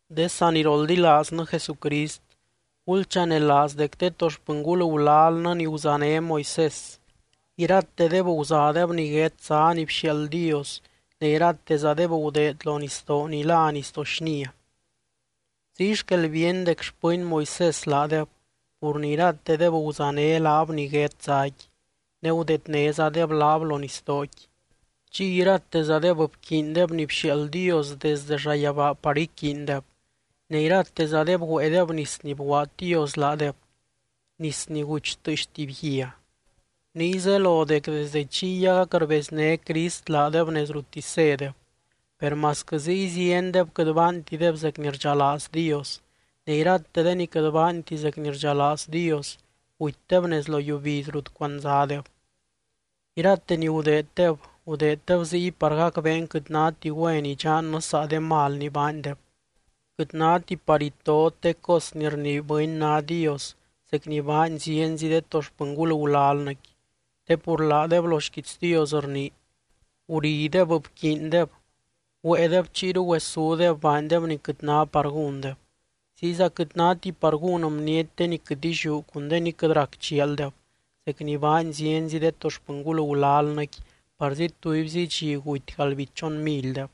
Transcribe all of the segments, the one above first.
De saniroldilaaznɨ Jesucrist, gulchanelaaz dec de to xpɨngul gulalnɨ ni guzané Moisés, iratedeb guzadeb niguét zá ni bxiaald Dios ne iratezadeb gudeed lo nisdoo ni lá Nisdoo Xnia. Ziy xquel bíeny dec xpɨny Moisés laadeb pur ni iratedeb guzané laab niguét záqui, ne gudednézadeb laab lo nisdooqui. Chiy iratezadeb bquiindeb ni bxiaald Dios desde llayabaa par iquiindeb. Ne iratezadeb güéedeb nis ni bguaad Dios laadeb, nis ni guch tɨɨx tuby guia. Niy zelo dec desdɨ chiy agac rbezné Crist laadeb nez ruttisy zédeb. Per masquɨ ziy ziendeb quɨt baantideb zec ni rdxalaaz Dios, ne irate de ni quɨt baanti zec ni rdxalaaz Dios, gutydeb nez lo yiubiz rut cuandzadeb. Irate ni gudeeddeb, gudeeddeb ziy par gacbeen quɨt náti güen idxannɨ saa de mal ni baandeb. Quɨt náti par itot de cos ni rnii bɨny ná dios zec ni baany zienzi de to xpɨngul gulalnɨqui, te pur laadeb lo xquiits Dios rnii: “Gurideb, bquiindeb, güéedeb chiyru güesúdeb baandeb ni quɨt ná par gúndeb.” Ziyza quɨt náti par gún bniety de ni quɨt illiú cun de ni quɨt rac chialdeb, zec ni baany zienzi de to xpɨngul gulalnɨqui parzi tubyzi dxi guty galdbichon milydeb.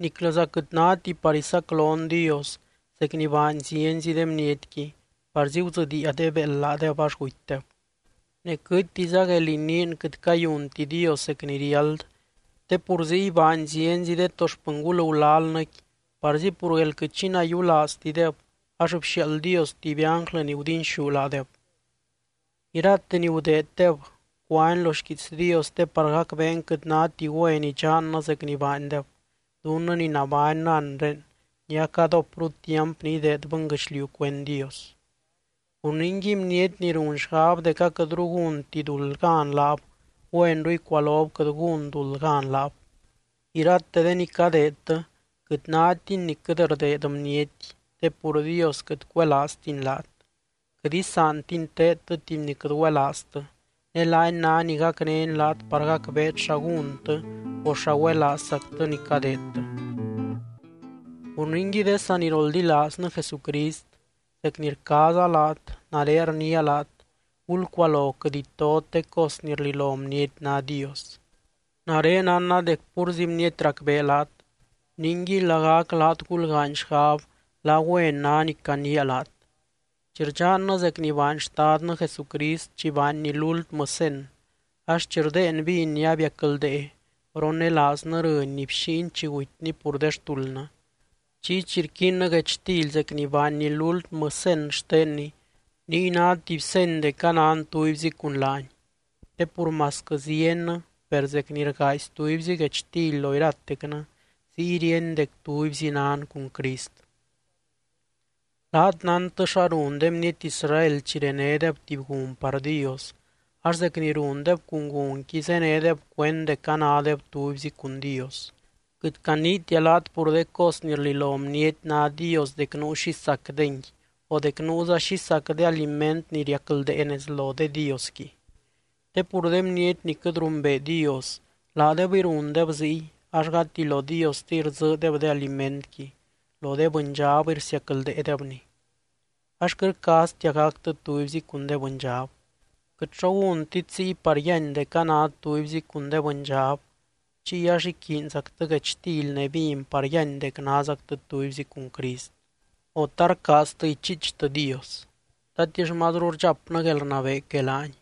Niclɨza quɨt náti par isaclon Dios zec ni baany zienzi de bnietqui, parzi gudzɨdiia de béeld laadeb ax gutydeb. Ne quɨtiza guél iniin quɨt cayunti Dios zec ni riáld, te pur ziy baany zienzi de to xpɨngul gulalnɨqui parzi pur guél quɨt xi nayiulaaztideb, ax bxiaald Dios tuby ánglɨ ni gudinxú laadeb. Irate ni gudeeddeb, cuani lo xquiits Dios te par gacbeen quɨt náti güen idxannɨ zec ni baandeb, dunnɨ ni nabánnɨ anre ni acadópru tiamp ni ideed bɨnguɨchliu cuend Dios. Pur ningui bniety ni run xgab dec aquɨtru gúnti duld gan laab, güenru icualob quɨt gún duld gan laab. Irate de ni cadeedtɨ quɨt nátini ni quɨt rdeed bniety, te pur Dios quɨt cuelaaztiny laat. Quɨt isaantiny teedtɨ tuby ni quɨt güelaaztɨ, ne laany ná ni gacnény laat par gacbeet xa gúntɨ o xa güelaazzactɨ ni cadeedtɨ. Pur ningui de saniroldilaaznɨ Jesucrist, zec ni rcaaza laat, nare rniia laat gulcualo quɨt itot de cos ni rlilo bniety ná dios. Nare nánna dec púrzi bniety racbee laat, ningui lagac laat gulgaany xgab la güen ná ni caniia laat. Chi rdxannɨ zec ni baany Xtadnɨ Jesucrist chi baanny lúltmɨ cen, ax chi rdéen vin ni abiacldee ronelaaznɨ rɨny ni bxíiny chi gutyny pur de xtuldnɨ. Chiy chi rquiinnɨ guechtily zec ni baanny lúltmɨ cen xtenny, niy ná tuby seny dec anan tubyzi cun laany. Te pur masquɨ ziennɨ, per zec ni rgaazy tubyzi guechtily lo iratecnɨ ziy ríeny dec tubyzi nan cun Crist. Laat nántɨ xa run de bniety Israel chi renédeb tuby gun par Dios, ax zec ni rundeb cun gunqui zénedeb cuend dec anádeb tubyzi cun Dios. Quɨt caniitia laat pur de cos ni rlilo bniety ná dios dec nuu xi sacdengui o dec nuuza xi sac de aliment ni riacldee nez lo de diosqui. Te pur de bniety ni quɨt rumbee Dios, laadebɨy rundeb ziy ax gati lo Diostiy rdzɨɨdeb de alimentqui, lo de bɨndxabɨy rsiacldeedebni. Ax quɨt rcaaztia gactɨ tubyzi cun de bɨndxab. Quɨt xo gúntit ziy par yíany dec anát tubyzi cun de bɨndxab, chiy ax iquiinzactɨ guechtily ne vin par yíany dec názactɨ tubyzi cun Crist. O, ¿ta rcaaztɨ ichiichtɨ Dios? ¿Tatix mazru rdxapnɨ guelrnabee que laany?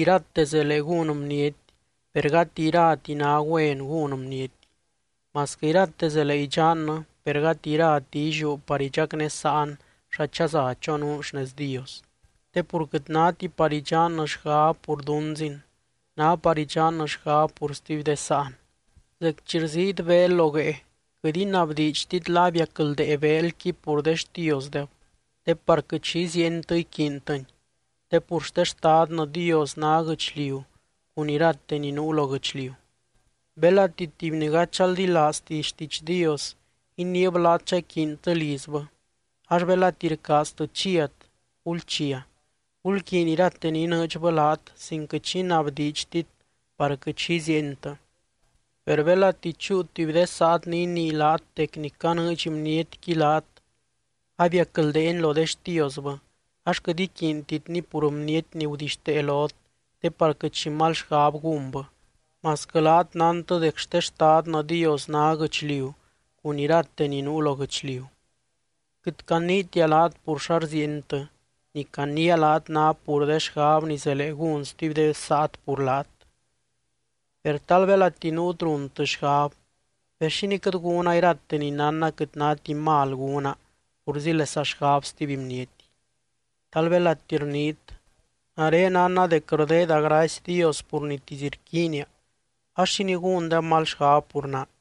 Irate zelee gún bniety, per gati irati ná güen gún bniety. Masquɨ irate zelee idxannɨ, per gati irati illiú par idxacnésaan xa chaza chonuun xnez Dios. Te pur quɨt náti par idxannɨ xgab pur dunzin, ná par idxannɨ xgab pur stuby de sáan. Zec chi rziit beel lo guee, quɨt inabdiidxtit la abiacldee beelqui pur de xtiosdeb, te par quɨt xi iziientɨ iquiintɨni. Te pur xte Xtadnɨ Dios ná guɨchliu cun irate ni nuu lo guɨchliu. Belati tuby ni gady chaldilaazti xtiidx Dios iniib laat chaquiintɨ lizbɨ, ax belati rcaaztɨ chiat, gulchia. Gulquiiny irate ni inɨɨdxbɨ laat sin quɨt xi inabdiidxtit par quɨt xi iziientɨ. Per belati chúu tuby de saat ni inii laat dec ni canɨɨdx bnietqui laat abiacldeeni lo de xtiosbɨ, ax quɨt iquiintitni pur bniety ni gudixtee lot te par quɨt xi mal xgab gúnbɨ, masquɨ laat nántɨ dec xte Xtadnɨ Dios ná guɨchliu cun irate ni nuu lo guɨchliu. Quɨt caniitia laat pur xa rziientɨ, ni caniia laat ná pur de xgab ni zelee gún stuby de saat pur laat. Per tal belati nuut runtɨ xgab: “Per, ¿xínii quɨt gúna irate ni nánna quɨt náti mal gúna purzílesa xgab stuby bniety? Tal belati rniit: Nare nánna dec rdeeda gracy Dios pur nitisy rquiinia ax, ¿xínii gúndeb mal xgab pur naa?”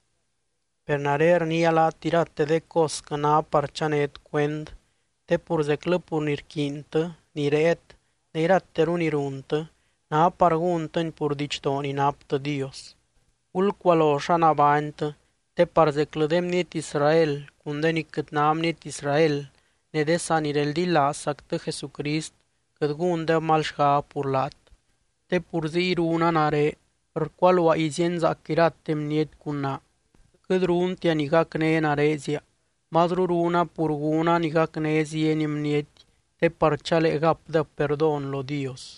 Per nare rniia laat irate de cosquɨ ná par chanét cuend, te pur zeclɨ pur ni rquiintɨ, ni réet ne irateru ni runtɨ, ná par gúntɨni pur didxdoo ni naptɨ Dios. Gulcualo xa nabánytɨ te par zeclɨ de bniety Israel cun de ni quɨt ná bniety Israel ne de sanireldilaazzactɨ Jesucrist quɨt gúndeb mal xgab pur laat. Te pur ziy runa nare, rcualuaa izíenzaac irate bniety cun naa. Quɨt runtia ni gacné narezia, mazru runa pur gúna ni gacné zieny bniety te par chalee gapdeb perdón lo Dios.